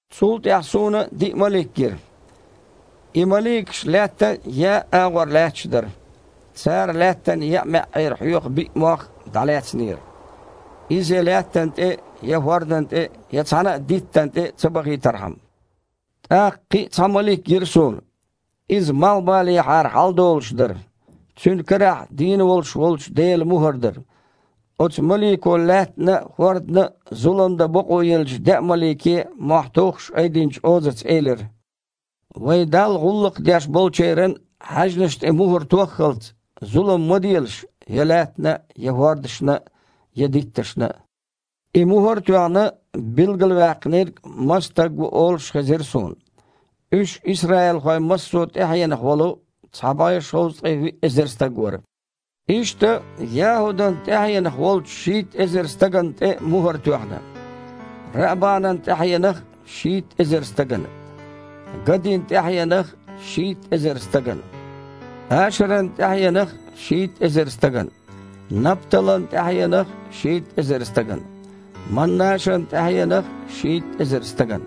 Цул тІаьхьа суна диъ малик гира. И маликаш лаьттан еа а агІор лаьтташ дара. Цара Лаьттан еа маьІІера хьоькху биъ мох дІалаьцнера, иза я лаьттана тІе, я хІордана тІе, я цхьанна а диттана тІе ца бахийтархьама. ТІаккха кхин а цхьа малик гира суна. Иза малхбалехьара хьаладолуш дара. Цуьнан карахь дийна волуш волчу Делан мухІар дара. Оцу малико лаьттана а, хІордана а зулам дан бакъо еллачу деа малике, мохь туххуш, айдинчу озаца элира: «Вайн Далла гІуллакх деш болчеран хьаьжнаш тІе мухІар тоххалц, зулам ма делаш я лаьттана, я хІордашна, я дитташна». И мухІар а тоьхна, билгалваьккхинарг маса стаг ву олуш а хезира суна. Уьш исраилхойн массо а тІаьхьенах волу цхьа бІе шовзткъе виъ эзар стаг вара. Иштта, ЯхІудан тІаьхьенах волчу шийтта эзар стагана тІе а мухІар тоьхна; Раабанан тІаьхьенах а – шийтта эзар стагана; Гадин тІаьхьенах а – шийтта эзар стагана; Ашаран тІаьхьенах а – шийтта эзар стагана; Напталан тІаьхьенах а – шийтта эзар стагана; Маннашан тІаьхьенах а – шийтта эзар стагана;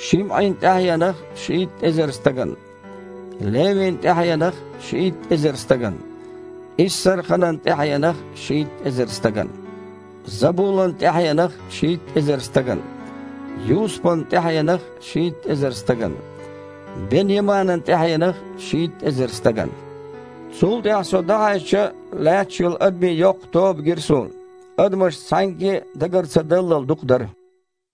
ШимІин тІаьхьенах а – шийтта эзар стагана; Левин тІаьхьенах а – шийтта эзар стагана; Иссарханан тІаьхьенах а – шийтта эзар стагана; Забулан тІаьхьенах а – шийтта эзар стагана; Юсупан тІаьхьенах а – шийтта эзар стагана; Бен-Яманан тІаьхьенах а – шийтта эзар стагана. Цул тІаьхьа со дІахьаьжча, лаьтташ йолу адамийн йоккха тоба гира суна. Адамаш цхьаьнгге а дагар ца даллал дукха дара.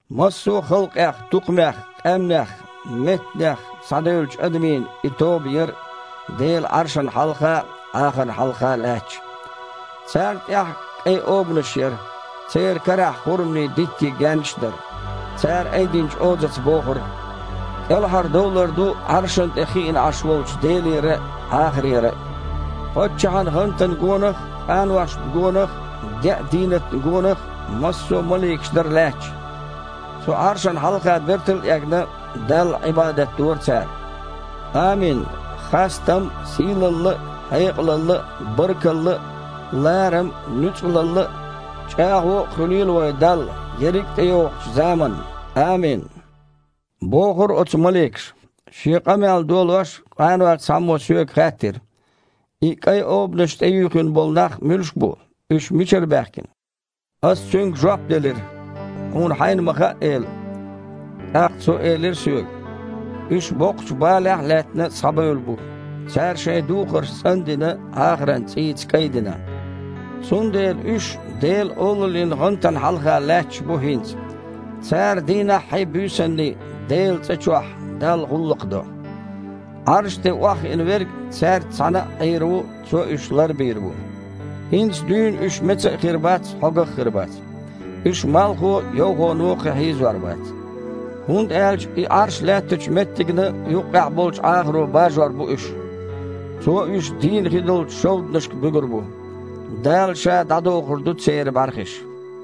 Массо а халкъех, тукхамех, къаьмнех, меттанех схьадевллачу адамийн и тоба яра Делан Іаршана хьалха а, Іахарна хьалха а лаьтташ. Царна тІехь кІайн обанаш а яра, церан карахь хурманийн диттийн гаьннаш а дара. Цара айдинчу озаца бохура: «КІелхьардовлар ду Іаршана тІе хиъна Іаш волчу Делера а, Іахарера а!» Паччахьан гІантана гонах а, къаношна гонах а, деа дийнатна гонах а массо а маликаш дара лаьтташ. Цу Іаршана хьалха бертал а эгна, Далла Іибадат дора цара. «Амин! Хастам а, сийлалла а, хьекъалалла а, баркалла а, ларам а, нуьцкъалалла а, чІагІо а хуьлийла вайн Далла ерриг а тІейогІучу заманна! Амин!» – бохура оцу маликаша. Шен къамел долош, къанойх цхьаммо соьга хаьттира: «И кІайн обанаш тІеюьйхина болу нах муьлш бу? Уьш мичара баьхкина?» Ас цуьнга жоп делира: «Хьуна хьайна ма хаьа, эла». ТІаккха цо элира соьга: «Уьш, боккхачу балехь а лаьттина, схьабевлла бу. Цара шайн духарш, цІан а дина, Іахаран цІийца кІайдина. Цундела уьш Делан олаллин гІантана хьалха лаьтташ бу хІинца. Цара дийнаххьий, буьйсанний Делан цІа чохь Далла гІуллакх до. Іарша тІе охьахиъна Верг цаьрца цхьаьна а Іийр ву, Цо уьш лар а бийр бу. ХІинца дуьйна уьш меца а хир бац, хьогах а хир бац. Уьш малхо а, йовхоно а кхин хьийзор бац. ХІунда аьлча и Іарш лаьттачу меттигна юккъехь болчу Іахаро бажор бу уьш. Цо уьш дийна хи долчу шовданашка буьгур бу. Дала Ша дІадохур ду церан бІаьрхиш».